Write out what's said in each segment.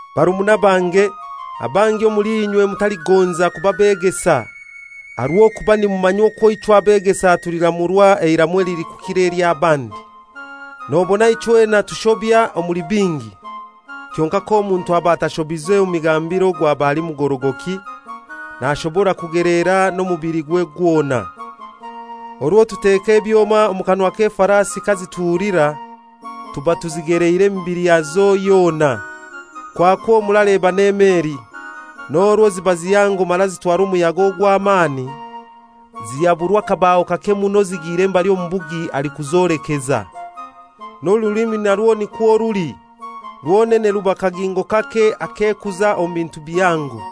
Barumuna bange, abangi omuli inywe mutaligonza kuba begesa, aha rw'okuba nimumanya okwo ichwe abegesa tuliramurwa eiramu elilikukira ely'abandi. Nobona ichwena tushobya omuli bingi. Kyonkai k'omuntu aba atashobize mu migambire ogwo aba ali mugorogoki, nashobora kugelera n'omubiligwe gwona. Orwo tuteka ebyoma omu kanwa k'efarasi kazituhulira, tuba tuzigeleire emibili yazo yona. Kwakwo muraleba n'emeli. N'orwo ziba zihango mara zitwarwa omuyaga ogw'amani, zihaburwa akabaho kake muno zigiire mbali omubugi alikuzolekeza. N'orulimi narwo nikwo ruli; rwonene ruba kagingo kake akekuza omu bintu bihango.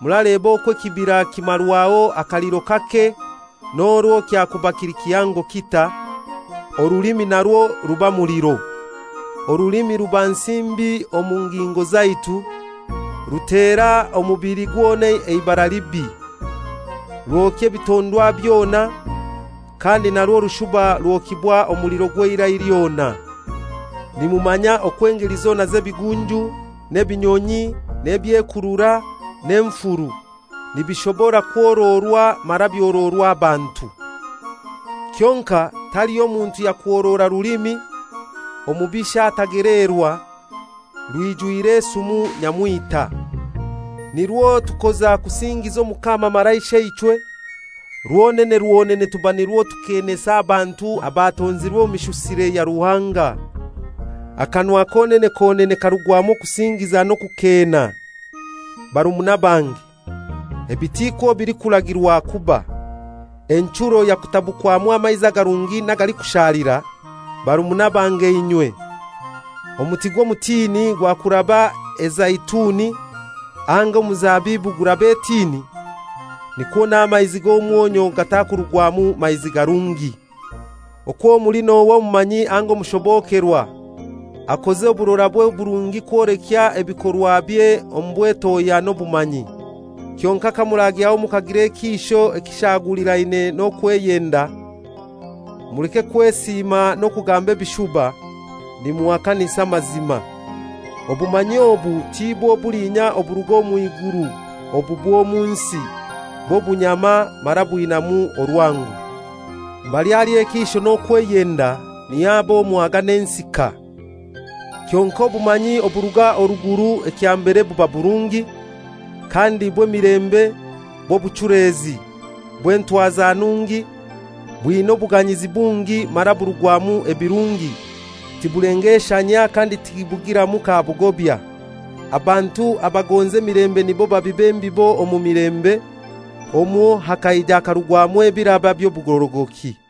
Muraleba okwo ekibira kimarwaho akaliro kake n'orwo kyakuba kili kihango kitai! Orulimi narwo ruba muliro. Orulimi ruba nsi mbi omu ngingo zaitu, rutera omubili gwona eibara libi, rwokya ebitondwa byona, kandi narwo rushuba rwokibwa omuliro gw'eirai lyona. Nimumanya okwo engeli zona z'ebigunju, n'ebinyonyi, n'ebyekurura, n'enfuru, nibishobora kworoorwa mara byoroorwa abantu. Kyonkai taliho muntu yakworoora rulimi, omubisha atageleerwa, rwijwire esumu nyamwita. Nirwo tukoza kusingiza Omukama mara Isheichwe, rwonene rwonene tuba nirwo tukeenesa abantu abatonzirwe omu mishusire ya Ruhanga. Akanwa konene konene karugwamu okusingiza n'okukeena. Barumuna bange, ebi tikwo bilikuragirwa kuba. Enchuro yakutabukwamu amaizi agarungi n'agalikushalira? Barumuna bange inywe! Omuti gw'omutini gwakuraba ezeituni, anga omuzabibu kuraba etini? Nikwo n'amaizi g'omwonyu gatakurugwamu maizi garungi. Okwo muli n'ohai omumanyi anga omushobokerwa? Akoze oburorabwe oburungi kwoleka ebikorwabye omu bwetohya n'obumanyi. Kyonkai kamuragyaho mukagira ekiisho ekishaguliraine n'okweyenda, muleke kwesiima n'okugamba ebishuba nimuhakanisa amazima. Obumanyi obu tibwo bulinya oburuga mw'iguru. Obu bw'omu nsi, bw'obunyama mara bwinamu orwango. Mbali hali ekiisho n'okweyenda, niho haba omwaga n'ensika. Kyonkai obumanyi oburuga oruguru ekya mbere buba burungi, kandi bw'emilembe, bw'obuchulezi, bw'entwaza nungi, bwina obuganyizi bungi mara burugwamu ebirungi, tibulengeshanyia kandi tibugiramu ka bugobya. Abantu abagonza emilembe nibo babiba embibo omu milembe, omwo hakaija hakarugwamu ebiraba by'obugorogoki.